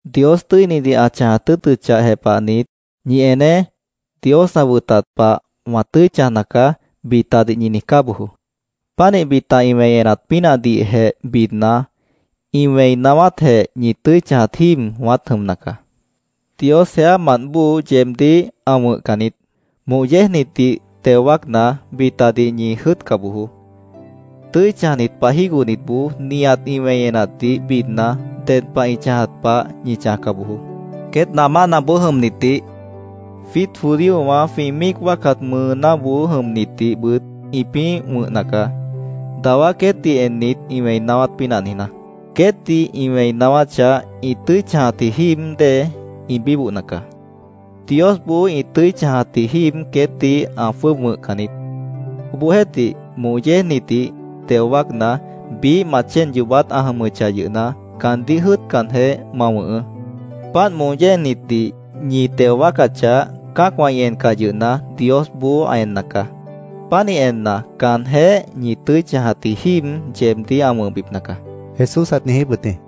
“Dios tʉ́inidih ã chãjat tʉ́ʉtʉchah jepahnit, ‘¡Ñi eneé! Dios ã wʉtat pah wã tʉ́i chãjna caá’, bitadih ñi niijcá bojoó. Pánih bita ĩ wẽi enat pínahdihjeh bidna, ĩ wẽi naáwátjeh ñi tʉ́i chãjat jíib wãát jʉmna caá. Dios jeámant bóo yeebdíh ã wʉ̃hcan niít. “Moh yéejnitdih teo wáacna, bitadih ñi jʉ́ʉtca bojoó. Tʉ́i chãjnit pah jígohnitboó nihat ĩ wẽi enatdih bidna, ded pah ĩ chãjat pah ñi chãjca bojoó. Queét namánaboó jʉmnitdih, jwiít judíowã jwĩ míic wáacat mʉʉnáboó jʉmnitdihbʉt ĩpĩ́ wʉ̃hna caá, dawá queétdih ennit, ĩ wẽi naáwát pínah niijná. Queétdih ĩ wẽi naáwáchah, ĩ tʉ́i chãjatji jíib dée ĩ bíbohna caá. Diosboó ĩ tʉ́i chãjatji jíib queétdih ã jwʉ́ʉb wʉ̃hcan niít. Obohjeéhtih, moh yéejnitdih teo wáacna, biíh ma chéen yoobát ã jʉmʉchah yʉhna, caandíh jʉ́ʉtcanjeh, ma wʉ̃hʉʉ́. Páant moh yéejnitdih ñi teo wáacachah, cã́acwã ĩ encah yʉhna, Diosboó ã enna caá. Pánih enna, caanjéh ñi tʉ́i chãjatji jíib yeebdíh ã wʉ̃hbipna caá”, Jesús ãt niijíp wʉt jĩ.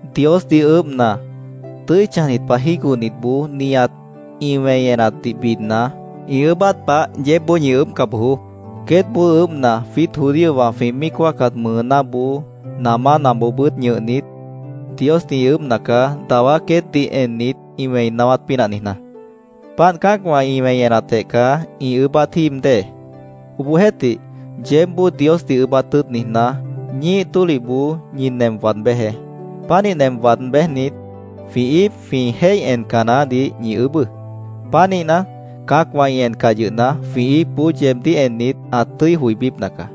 “Diosdih ʉʉ́bhna, tʉ́i chãjnit pah jígohnitboó nihat ĩ wẽi enatdih bidna, ĩ ʉʉ́bát pah yeébboó ñi ʉʉ́bhca bojoó. Queétboó ʉʉ́bhna, jwiít judíowã jwĩ míic wáacat mʉʉnáboó, namánaboobʉ́t ñʉhnit, Diosdih ĩ ʉʉ́bhna caá, dawá queétdih ennit, ĩ wẽi naáwát pínah niijná. Páant cã́acwã ĩ wẽi enatjeh caá ĩ ʉʉ́bát jíib dée. Obohjeéhtih, yeébboó Diosdih ʉʉ́bát tʉ́ʉt niijná, ñíih tólihboó ñi nem waad béjeé. Pánih nem waad béjnit, jwĩ íip jwĩ jéih enca naáhdih ñi ʉʉ́bʉ́. Pánihna, cã́acwã ĩ encah yʉhna, jwĩ íipboó yeebdíh ennit, ã tʉ́i joibípna caá.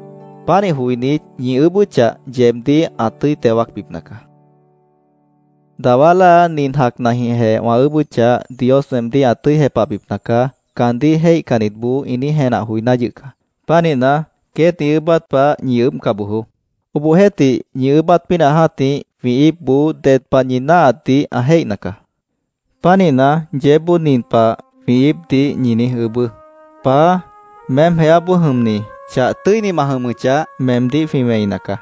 Pánih joinít, ñi ʉʉ́bʉ́chah, yeebdíh ã tʉ́i teo wáacbipna caá. “ ‘Dawá láa nin jacnajĩhjeh wã ʉʉ́bʉ́chah, Dios weemdíh ã tʉ́i jepahbipna caá’, caandíh jéihcannitboó ĩ niíj jenah joiná yʉh caá. Pánihna, queét ĩ ʉʉ́bát pah ñi ʉʉ́bhca bojoó. Obohjeéhtih, ñi ʉʉ́bát pínah jã́tih, jwĩ íipboó ded pah ñi náahatdih ã jéihna caá. Pánihna, yeébboó nin pah jwĩ íipdih ñi niíj ʉʉ́bʉ́: ‘Paá, meém jeáboó jʉmni, chah tʉ́ini ma jʉmʉchah, meemdíh jwĩ wẽina caá.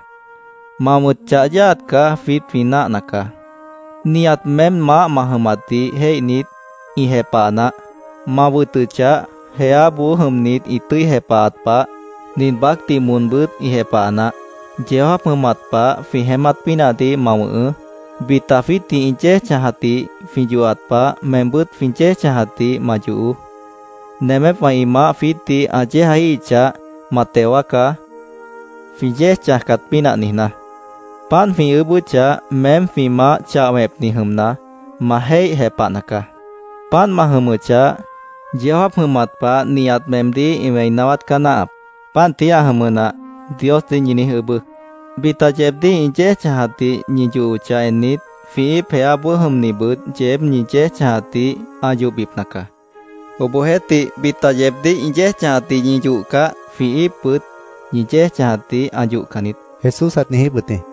Ma wʉ̃t chah yáaat caá jwiít jwĩ náahna caá. Nihat meém maáh ma jʉmatdih jéihnit, ĩ jepaha naáh. Ma wʉtʉchah, jeáboó jʉmnit ĩ tʉ́i jepahat pah, nin baácdih moonbʉ́t ĩ jepaha naáh. Yeó jáap jʉmat pah jwĩ jeémát pínahdih ma wʉ̃hʉʉ́. Bita jwiítdih ĩ yéej chãjatdih jwĩ yohat pah, meembʉ́t jwĩ yéej chãjatdih ma yohoó. Nemépwã ĩ maáh jwiítdih ã yéejaíhichah, ma teo wáacá, jwĩ yéej chãjcat pínah niijná. Páant jwĩ ʉʉ́bʉ́chah, meém jwĩ Maáh chah wẽpni jʉmna, ma jéih jepahna caá. Páant ma jʉmʉchah, yeó jáap jʉmat pah nihat meemdíh ĩ wẽi naáwát caá náahap. Páant tií ã jʉmʉ nah’, Diosdih ñi niíj ʉʉ́bʉ́. “Bita yeebdíh ĩ yéej chãjatdih ñi yohochah ennit, jwĩ íip jeáboó jʉmnibʉt yeéb ñi yéej chãjatdih ã yohbipna caá. Obohjeéhtih, bita yeebdíh ĩ yéej chãjatdih ñi yohcah, jwĩ íipbʉt ñi yéej chãjatdih ã yohcan niít”, Jesús ãt niijíp wʉt jĩ.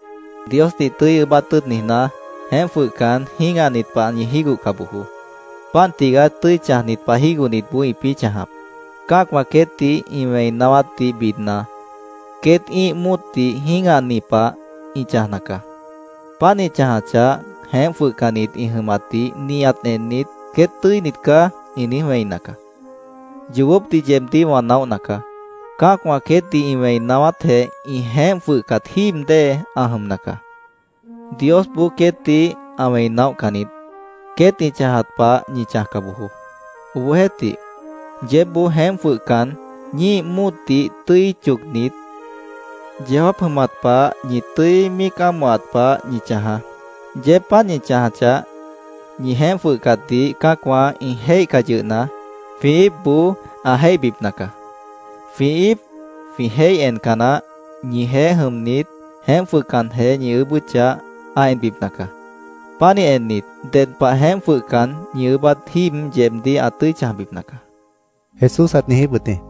“Diosdih tʉ́i ʉʉ́bát tʉ́ʉt niijná, jeémp jwʉhcan, jĩ́gahnit pah ñi jígohca bojoó. Páant tigaá tʉ́i chãjnit pah jígohnitboó ĩpĩ́ chãjap. Cã́acwã queétdih ĩ wẽi naáwátdih bidna, queét ĩ́ih móotdih jĩ́gahni pah ĩ chãjna caá. Páant ĩ chãjachah, jeémp jwʉhcannit ĩ jʉmatdih nihat ennit, ‘Queét tʉ́init caá’, ĩ niíj wẽina caá. Yoobópdih yeebdíh wã naóhna caá: Cã́acwã queétdih ĩ wẽi naáwátjeh ĩ jeémp jwʉhcat jíib dée ã jʉmna caá. Diosboó queétdih ã wẽi naóhcan niít. Queét ĩ chãjat pah ñi chãjca bojoó. Obohjeéhtih, yeébboó jeémp jwʉhcan, ñíih móotdih tʉ́i chocnit, yeó jáap jʉmat pah ñi tʉ́i míic ámohat pah ñi chãjaá. Yeéb páant ñi chãjachah, ñi jeémp jwʉhcatdih cã́acwã ĩ jéihcah yʉhna, jwĩ íipboó ã jéihbipna caá. Jwĩ íip, jwĩ jéih enca naáh, ñijeéh jʉmnit, jeémp jwʉhcanjeh, ñi ʉʉ́bʉ́chah, ã enbipna caá. Pánih ennit, ded pah jeémp jwʉhcan, ñi ʉʉ́bát jíib yeebdíh ã tʉ́i chãjbipna caá”, Jesús ãt niijíp wʉt jĩ.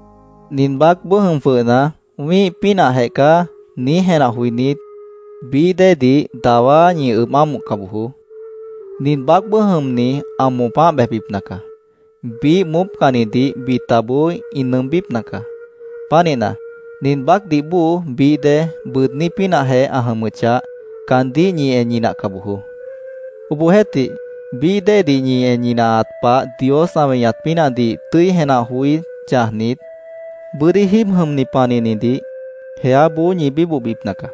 “Nin baácboó jʉm jwʉhna, ‘Wĩ́ih pínahjeh caá’, niíj jenah joinít, bií déedih dawá ñi ʉb ámohca bojoó. Nin baácboó jʉmni ã moopáh bejbipna caá. Biíh moópcannidih bitaboó ĩ nʉʉmbípna caá. Pánihna, nin baácdih bóo bií dée bʉʉdní pínahjeh ã jʉmʉchah, caandíh ñi en ñinahca bojoó. Obohjeéhtih, bií déedih ñi en ñinahat pah Dios ã weñat pínahdih tʉ́i jenah joí chãjnit, bʉ́dí jíib jʉmni panihnidih jeáboó ñi bíbohbipna caá.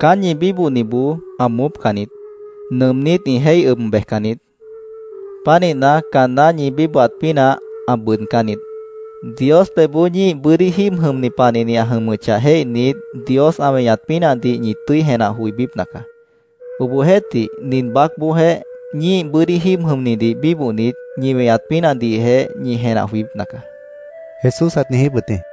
Caán ñi bíbohniboó ã moópcan niít. Nʉʉmnít ĩ jéih ʉb bejcan niít. Pánihna, caanná ñi bíbohat pínah ã bʉʉdcán niít. Dios pebhboó ñíih bʉ́dí jíib jʉmni panihni ã jʉmʉchah jéihnit, Dios ã weñat pínahdih ñi tʉ́i jenah joibípna caá. Obohjeéhtih, nin baácboojéh ñíih bʉ́dí jíib jʉmnidih bíbohnit, ñi weñat pínahdihjeh ñi jenah joibípna caá”, Jesús ãt niijíp wʉt jĩ.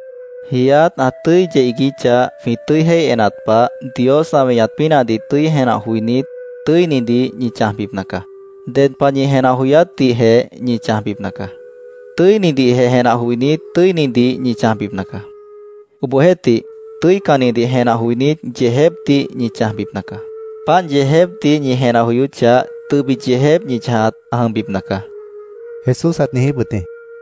“Jiiát ã tʉ́i yeh iiguíchah, jwĩ tʉ́i jéih enat pah, Dios ã weñat pínahdih tʉ́i jenah joinít, tʉ́inidih ñi chãjbipna caá. Ded pah ñi jenah joyátdihjeh ñi chãjbipna caá. Tʉ́inidih jenah joinít, tʉ́inidih ñi chãjbipna caá. Obohjeéhtih, tʉ́icannidih jenah joinít, yeejépdih ñi chãjbipna caá. Páant yeejépdih ñi jenah joyóchah, tʉbit yeejép ñi chãjat ã jʉmbipna caá”, Jesús ãt niijíp wʉt jĩ.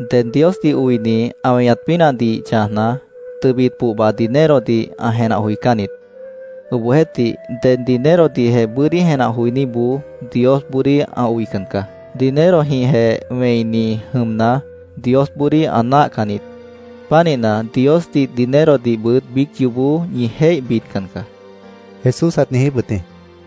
“Ded Diosdih oini ã weñat pínahdih chãjna, tʉbit pohba dinerodih ã jenah joicán niít. Obohjeéhtih, ded dinerodihjeh bʉ́dí jenah joiníboó Diosboodíh ã oican caá. Dinerojĩhjeh wẽini jʉmna, Diosboodíh ã náahcan niít. Pánihna, Diosdih, dinerodihbʉt biíc yoobó ñi jéih bidcan caá”, Jesús ãt niijíp wʉt jĩ.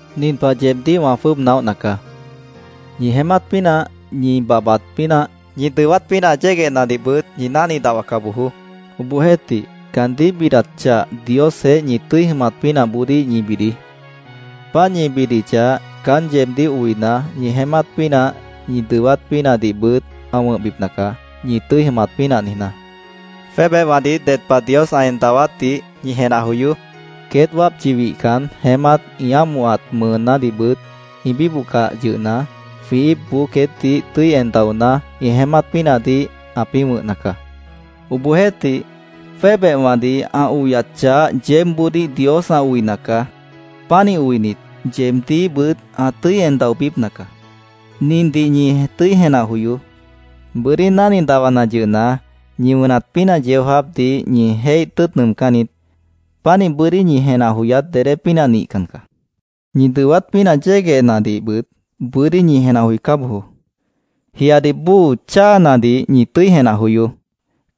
“Nin pah yeebdíh wã jwʉ́ʉb naóhna caá: Ñi jeémát pínah, ñi babhbat pínah, ñi dʉwát pínah yéguehnadihbʉt ñi náhni dahwaca bojoó. Obohjeéhtih, caandíh bidat chah Diosjeéh ñi tʉ́i jʉmat pínahboodíh ñi bidií. Páant ñi bidichah, caán yeebdíh oina, ñi jeémát pínah, ñi dʉwát pínahdihbʉt ã wʉ̃hbipna caá, ñi tʉ́i jʉmat pínah niijná. Jwébehwãdih ded pah Dios ã en dawátdih ñi jenah joyoó. Queét wápchi wihcan, jeémát ĩ ámohat mʉʉnádihbʉt ĩ bíbohcah yʉhna, jwĩ íipboó queétdih tʉ́i en daoná, ĩ jeémát pínahdih ãpĩ́ wʉ̃hna caá. ¡Obohjeéhtih, jwébehwãdih ã oyat chah yeébboodíh Dios ã oina caá! Pánih oinit, yeebdíhbʉt ã tʉ́i en daobípna caá. Nindih ñi tʉ́i jenah joyoó: Bʉ́dí náhni dahwana yʉhna, ñi wʉnat pínah yeó jáapdih ñi jéih tʉ́ʉt nʉʉmcán niít. Pánihna, bʉ́dí ñi jenah joyát dedé pínah nihcan caá. “Ñi dʉwát pínah yéguehnadihbʉt bʉ́dí ñi jenah joicá bojoó. Jiadih bóo cháanadih ñi tʉ́i jenah joyoó.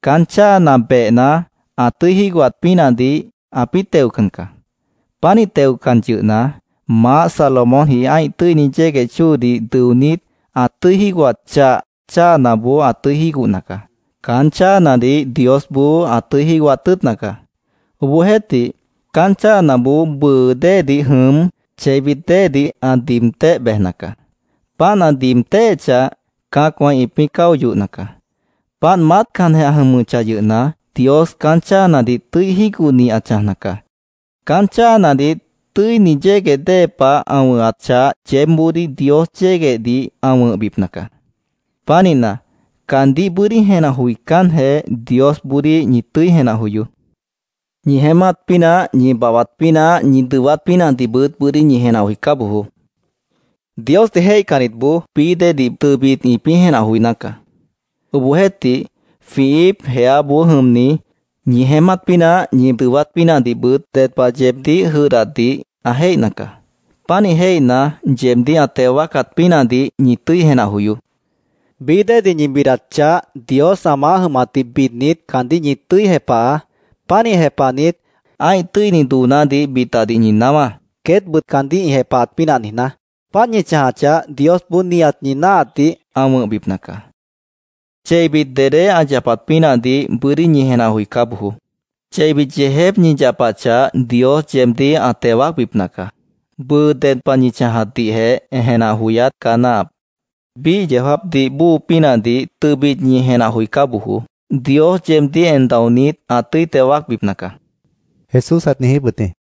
Caán cháana behna, ã tʉ́i jígohat pínahdih ãpĩ́ teocan caá. Pánih teocan yʉhna, maáh Salomónji ã́ih tʉ́ini yégueh chóodih dʉonít, ã tʉ́i jígohat chah cháanaboó ã tʉ́i jígohna caá. Caán cháanadih Diosboó ã tʉ́i jígohat tʉ́ʉtna caá. Obohjeéhtih, caán cháanaboó bʉʉ déedih jʉm, cheibit déedih ã diib téh bejna caá. Páant ã diib téhechah, cã́acwã ĩpĩ́ cáo yohna caá. Páant maátcanjeh ã jʉmʉchah yʉhna, Dios caán cháanadih tʉ́i jígohni ã chãjna caá. Caán cháanadih tʉ́ini yégueh dée pah ã wʉ̃hat chah yeébboodíh Dios yéguehdih ã wʉ̃hbipna caá. Pánihna, caandíh bʉ́dí jenah joicánjeh, Diosboodíh ñi tʉ́i jenah joyoó. Ñi jeémát pínah, ñi babhbat pínah, ñi dʉwát pínahdihbʉt bʉ́dí ñi jenah joicá bojoó. Diosdih jéihcannitboó bií déedih tʉbit ĩpĩ́ jenah joiná caá. Obohjeéhtih, jwĩ íip jeáboó jʉmni, ñi jeémát pínah, ñi dʉwát pínahdihbʉt ded pah yeebdíh jʉdhdatdih ã jéihna caá. Pánih jéihna, yeebdíh ã teo wáacat pínahdih ñi tʉ́i jenah joyoó. Bií déedih ñi bidat chah, Dios ã maáh jʉmatdih bidnit, caandíh ñi tʉ́i jepahaá. Pánih jepahnit, ã́ih tʉ́ini doonádih bitadih ñi naáwá, queétbʉt caandíh ĩ jepahat pínah niijná. Páant ñi chãjachah, Diosboó nihat ñi náahatdih ã wʉ̃hbipna caá. Cheibit dedé ã yapat pínahdih bʉ́dí ñi jenah joicá bojoó. Cheibit yeejép ñi yapachah, Dios yeebdíh ã teo wáacbipna caá. Bʉʉ ded pah ñi chãjatdihjeh jenah joyát caá náahap. Biíh yeó jáapdih bóo pínahdih tʉbit ñi jenah joicá bojoó. Dios yeebdíh en daonít, ã tʉ́i teo wáacbipna caá”, Jesús ãt niijíp wʉt jĩ.